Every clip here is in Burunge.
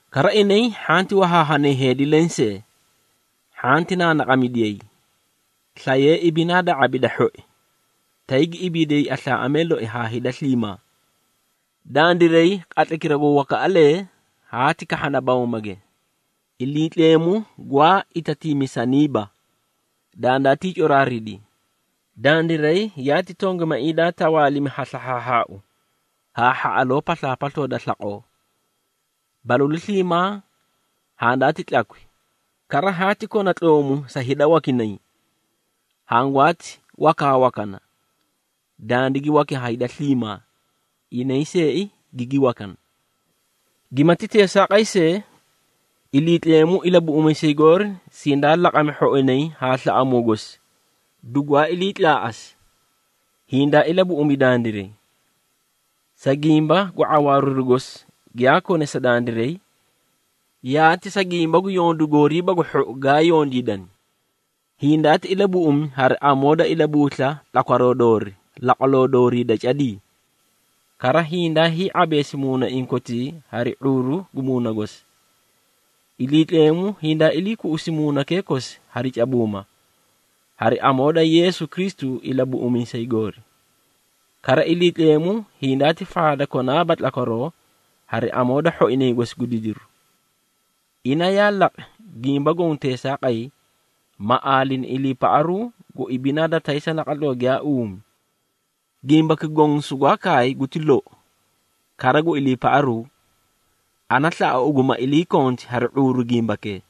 Kara inay hhanti wahaahanay heedi lensee, hhanti naanaqamidiyay, slayee ibidinaa da ⁄abi da hhoi, tay gi ibiidiyay aslaaꞌamee loi haa hida sliimaa. Dandiray qatlaykira gu wakaꞌalee haati kahhana bawmage, Iliitleemu gwaa itatiimisaniiba, dandaatii coraaridi, dandiray yaati tongimaiĩ daa tawaalimi ha slahhaahhaau haa hhaꞌaloo paslaapasloo da slaqoo. Balalu sliimaa handaati tlakwi, kara haati kona tloomu sa hida wakinay. Hangwaati wakaawakana, dandigi waki ha hida sliimaa, inay seei gigi wakani. Gimati teesaaqay see, Iliitleemu Ilabuꞌumiisay goori sindaa laqami hhoinay haa slaꞌamuu gosi, dugwaa ilii tlaaꞌasi, hindaa ilabuꞌumi dandiray, sa gimba gu ⁄awaariru gosi giyaa kone sa dandiray, yaati sa gimba gu yondu gooriiba gu hhou gaa yondiidani. Hindaati ilabuꞌumi hari amoo da ilabuusla tlakwaroo doori laqwaloo doorii da cadii, kara hindaa hii⁄abeesi muunaiĩ kotii hari ⁄uuru gu Muuna gosi. Iliitleemu hindaa ilii kuꞌusi Muunakee kosi hari cabuuma, hari amoo da Yeesu Kristu Ilabuꞌumiisay goori. Kara Iliitleemu hindaati faadi konaaba tlakwaroo hari amoo da hhoinay gosi gu didiru. Ina yaa laqi gimba goõ teesaaqay, ma aalini iliipaꞌaru gu ibinaa da taysa naqatloo giyaa uumi. Gimbaki goõ sugwaa kaay guti lou, kara gu iliipaꞌaruu, ana slaꞌa ugu ma iliikonti hari ⁄uuru gimbakee,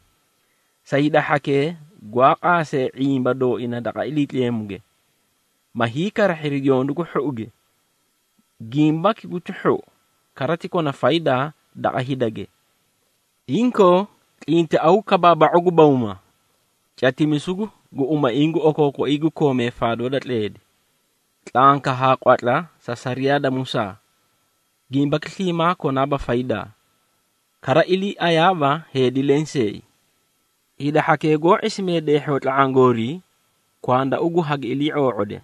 sa hida hhakee gwaa qaasee ⁄imba dooina daqa Iliitleemuge, ma hiikarahhiri yondu gu hhouge. Gimbaki guti hhou, kara ti kona faydaa daqa hidage. Inkoo tlintiaw kabaaba⁄u gu bawma, catimisu gu umaiĩ gu okookoiĩ gu kooma faadoo da tleedi, tlanka haa qwatla sa sariyaa da Musaa. Gimbaki sliimaa konaaba faydaa, kara iliiayaaba heedi lenseei. Hida hhakee goó ⁄isimee deehhoo tla⁄aã goorii, kwanda ugu hagi ilii⁄oo⁄ode,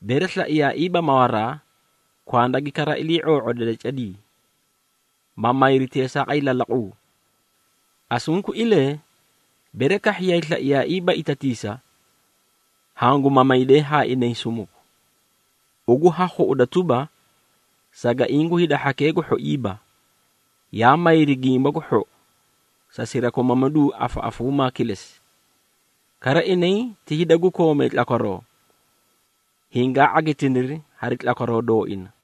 bere slaiyaaiiba mawaraa, kwanda gi kara ilii⁄oo⁄ode da cadii, ma mayri teesaaqay lalaquu. Asunkuilee bere kahhiyay slaiyaaiiba itatiisa, hangu mamaydee haa inay sumuku. Ugu ha khuꞌuda tuba, sagaiĩ gu hida hhakee gu hhoiiba, yaa mayri gimba gu lou sa sirakomamidu gu afaꞌafuumaa kilesi. Kara inay ti hida gu koomee tlakwaroo, hingaa ⁄agitiniri hari tlakwaroo dooina.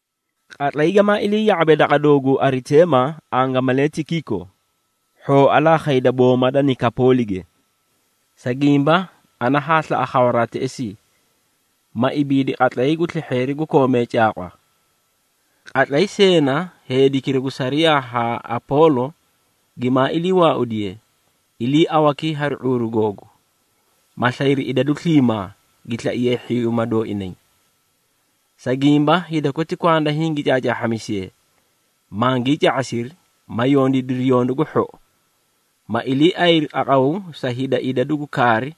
Qatlay gamaa ilii ya⁄abe daqa dooguu Ariteema angamalee Tikiiko, hhooa la khayda booma da Nikapoolige, sa gimba ana haa slaꞌa khawaraa teꞌesii, ma ibiidi qatlay gu slehheeri gu koomee caaqwa. Qatlay Seena, heedikira gu sariyaa haa Apoolo gimaa ilii waaudiye, iliiawakii hari ⁄uuru googu, ma slayri idadu sliimaa, gi slaiyeei hhiyuuma dooinay. Sa gimba, hida koti kwanda hingi caacaahhamisiyee, mangii ca⁄asiri, ma yondiidiri yondu gu hhou, ma iliiaꞌayri qaqaw sa hida idadu gu kaari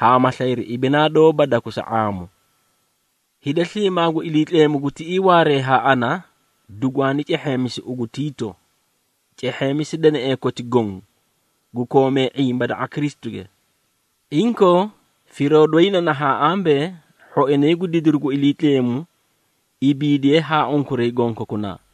haa ma slayri ibinaa doóba dakusa ⁄aamu. Hida sliimaa gu Iliitleemu gu tiꞌii waaree haa ana, dugwaani cehheemisi ugu, Tiito. Cehheemisi deneꞌee koti goõ, gu koomee ⁄imba daqa Kristuge. Inkoo firoo doyi na nahaã ambee, hhoinay gu didiru gu Iliitleemu ibiidiyee haa unkuray gonkokunaa.